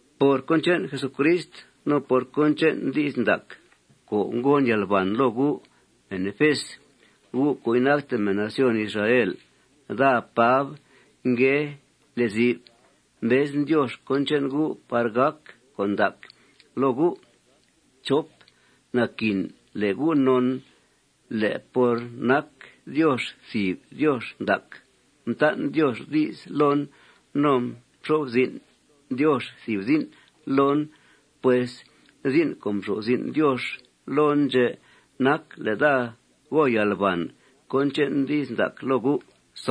Por cón che'n Jesucrist no por cón che'n di's ndac co' ngon yalban loo gu' mèn Efes, gu' co' inacte mèn nación Israel, daa, Pab ngue lezi'f. Mbezen Diox cón che'n gu' par gàc con' ndac loo gu'. Naquin le' gu' non le' por nac Diox thìb Diox ndac, mtan' Diox di's loon no mxo'f zin' Diox thìb zin' loon. Pues zin' co' mxo'f zin' Diox loon ndxè' nac le' daa go yalbàn cón che'n di's ndac loo gu'.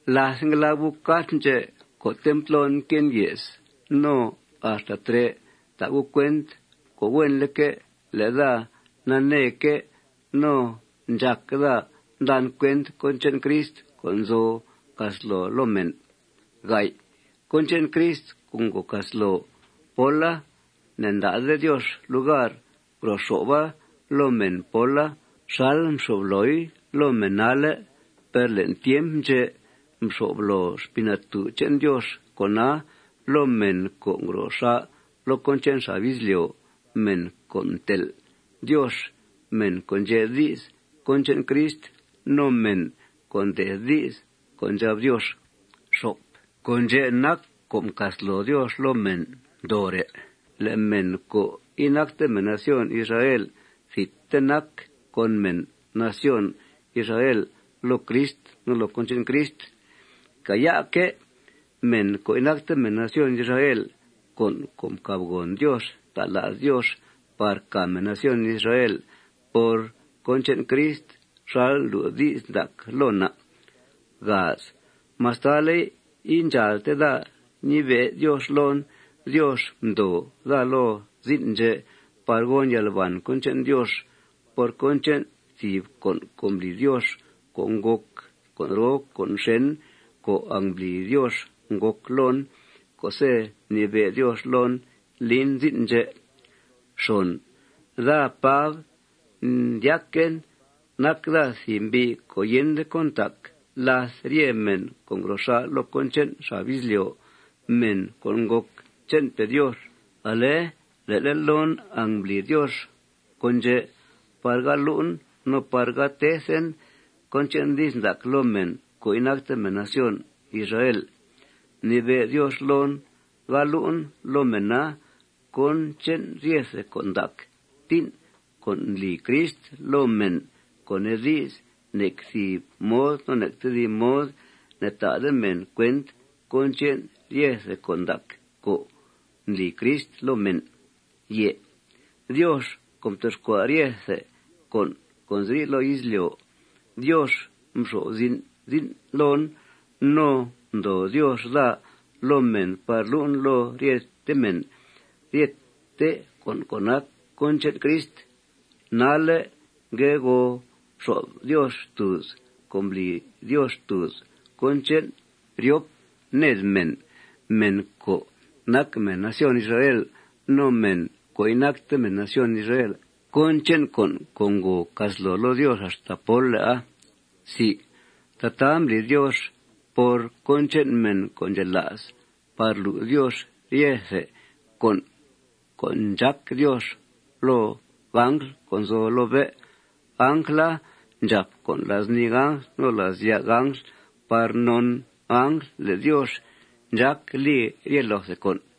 Láth ngue lab gu' cart ndxè' co'te' mtlon mque'en ye's no axta trè', ta' gu' cuent co' huenleque' le' daa naneeque' no ndxác daa ndan cuent cón che'n Crist co' nzo casloo loo mèn. Cón che'n Crist co' ngo casloo póla, ne'nda'de Diox lugar ngro xo'fa loo mèn póla xal mxyo'f looi loo mèn nalle'. Per le'n tiemp ndxè' mxo'f loo Xpii Natú' che'n Diox con'a loo mèn co' ngro xà' loo cón che'n xab izlyo', mèn co' mtel' Diox, mèn co' ndxe' di's cón che'n Crist no mèn co' mde'th di's co' ndxab Diox. Con' ndxè' nac co' mcasloo Diox loo mèn ndoore': Le' mèn co' inacte mèn nación Israel thidte nac con mèn nación Israel loo Crist no loo cón che'n Crist. Càaya'que' mèn co' inacte mèn nación Israel con' co' mcàbgòn Diox ta' la's Diox par càa mèn nación Israel por cón che'n Crist xal ndlu' di's ndac loo na'. Mastale' indxàalte daa ñibe' Diox loon, Diox mdoo daa loo zin' ndxè' par gon yalbàn cón che'n Diox. Por cón che'n thìb con' co' mbli Diox co' ngòc con' roo con' xèn co' angmbli Diox ngòc loon co'se' mnibe' Diox loon, lin zin' ndxè'. Daa, Pab, ndyaquen nac daa thìb mbi' co' yende cón ntac làth rye mèn co' ngro xà' loo cón che'n xab izlyo', mèn co' ngòc che'npe' Diox. Ale le'le' loon angmbli Diox con' ndxè' par ga lu'en no par ga tethen cón che'n di's ndac loo mèn co' inacte mèn nación Israel. Mnibe' Diox loon ga lu'en loo mèna cón che'n ryethe con' ndac tín' co' ndli Crist loo mèn, co' nee di's, nec thìb mod no nec tedib mod ne'ta'de mèn cuent cón che'n ryethe con' ndac co' ndli Crist loo mèn. Diox co' mtoxcua' ryethe con' co' nzi loo izlyo', Diox mxo'f zin' zin' loon. No ndoo Diox daa loo mèn par lu'en loo ryete mèn ryete con' co' nac cón che'n Crist. Nalle' ngue go xo'f Diox xtùuz co' mbli Diox xtùuz cón che'n ryop ned mèn, mèn co' nac mèn nación Israel no mèn co' inacte mèn nación Israel, cón che'n con' co' ngo casloo loo Diox axta pólle'a. Tataa mbli Diox por cón che'n mèn co' ndxela's par lu' Diox ryethe con' co' ndxác Diox loo angl co' nzo loo bé'. Angla ndxàp con' la's nii angl no la's ya' angl par non angl le' Diox ndxác li rye loothe con'.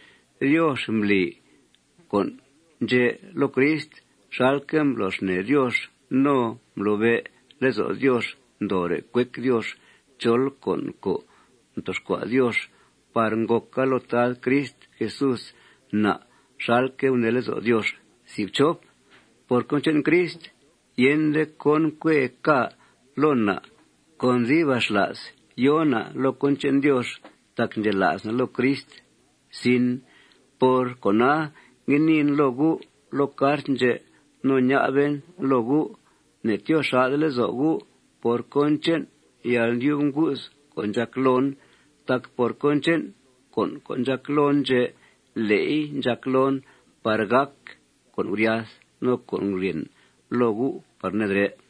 Diox mbli con' ndxè' loo Crist xalque' mblo xnee Diox no mblobe' lezo' Diox ndoore' cuec Diox chol con' co' mtoxcua' Diox par ngòca loo Tad Crist Jesús na' xalque' gunee lezo' Diox. Por cón che'n Crist, yende cón cuee ca' loo na'. Con dibaxla's yòo na' loo cón che'n Diox tac ndxela's na' loo Crist. Por cona, ngue niin loo gu' loo cart ndxè' no ña'ben loo gu': Ne'tyoo xà'de lezo' gu' por cón che'n yalndyub ngu's co' ndxàc loon. Tac por cón che'n con' co' ndxàc loon ndxè', le'i ndxàc loon par gàc con' guryath no con' guryèn loo gu' par nedrè'.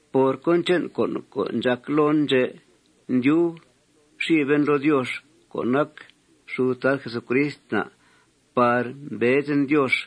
Por cón che'n con' co' ndxàc loon ndxè', ndyub xiben loo Diox co' nac xud Tad Jesucrist na' par mbezen Diox.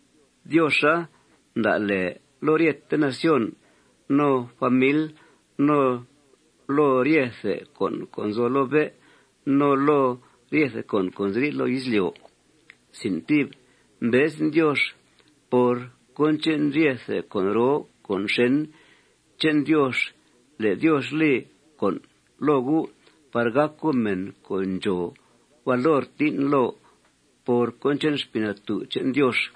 Dioxa mda' lèe loo ryete nación, no famil, no loo ryethe con' co' nzo loo bé', no loo ryethe con' co' nziri' loo izlyo'. Mbezen Diox por cón che'n ryethe con' roo con' xèn che'n Diox le' Diox li con' loo gu' par gàc gu' mèn co' ndxòo valor tín' loo por cón che'n Xpii Natú' che'n Diox.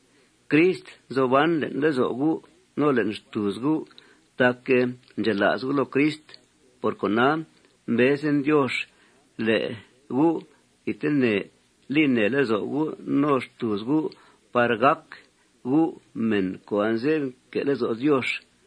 Crist nzo ban le'n lezo' gu' no le'n xtùuz gu' tac ndxela's gu' loo Crist. Por cona, mbezen Diox le' gu' thidtene li nèe lezo' gu' no xtùuz gu' par gàc gu' mèn co' anze'f nque' lezo' Diox.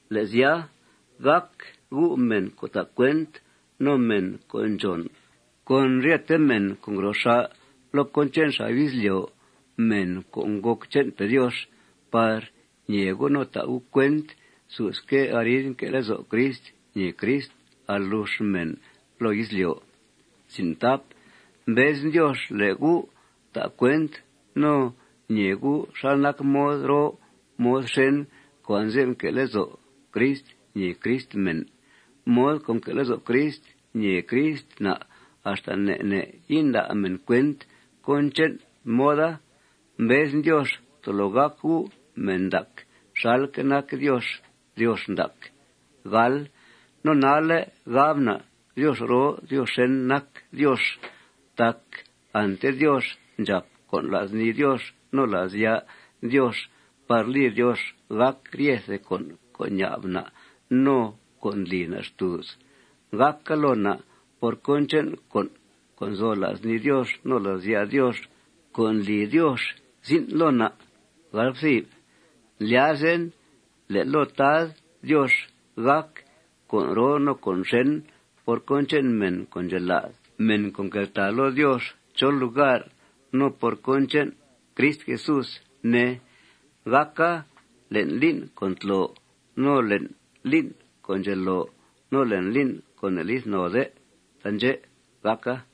Le' sya, gàc gu' mèn co' ta' cuent no mèn co' ndxòn con ryete mèn co' ngro xà' loo cón che'n xab izlyo', mèn co' ngòc che'npe' Diox, par ñee gu' no ta' gu' cuent susque' arid nque' lezo' Crist ñèe Crist alux mèn loo izlyo'. Mbezen Diox le' gu' ta' cuent no ñee gu' xal nac mod roo mod xèn co' anze'f nque' lezo' Crist ñèe Crist mèn. Mod co' nque' lezo' Crist ñèe Crist na', axta ne' ne' inda' mèn cuent cón che'n moda. Mbezen Diox tolo gàc gu' mèn ndac xalque' nac Diox Diox ndac. No nalle', gab na' Diox roo Diox xèn nac Diox tac ante Diox ndxàp con' la's nii Diox no la's ya' Diox par li Diox gàc ryethe con' co' ña'b na' no co' ndli na' xtùuz. Gàca loo na' por cón che'n con' co' nzo la's nii Diox no la's ya' Diox co' ndli Diox zin' loo na'. Ndlyazen le' loo Tad Diox gàc con' roo no con' xèn por cón che'n mèn co' ndxela's, mèn co' nqueltàa loo Diox chol lugar, no por cón che'n Crist Jesús, ne. Gàca le'n lín' co' ntlo, no le'n lín' co' ndxeloo, no le'n lín' co' ne'lith node. Taandxè' gàca.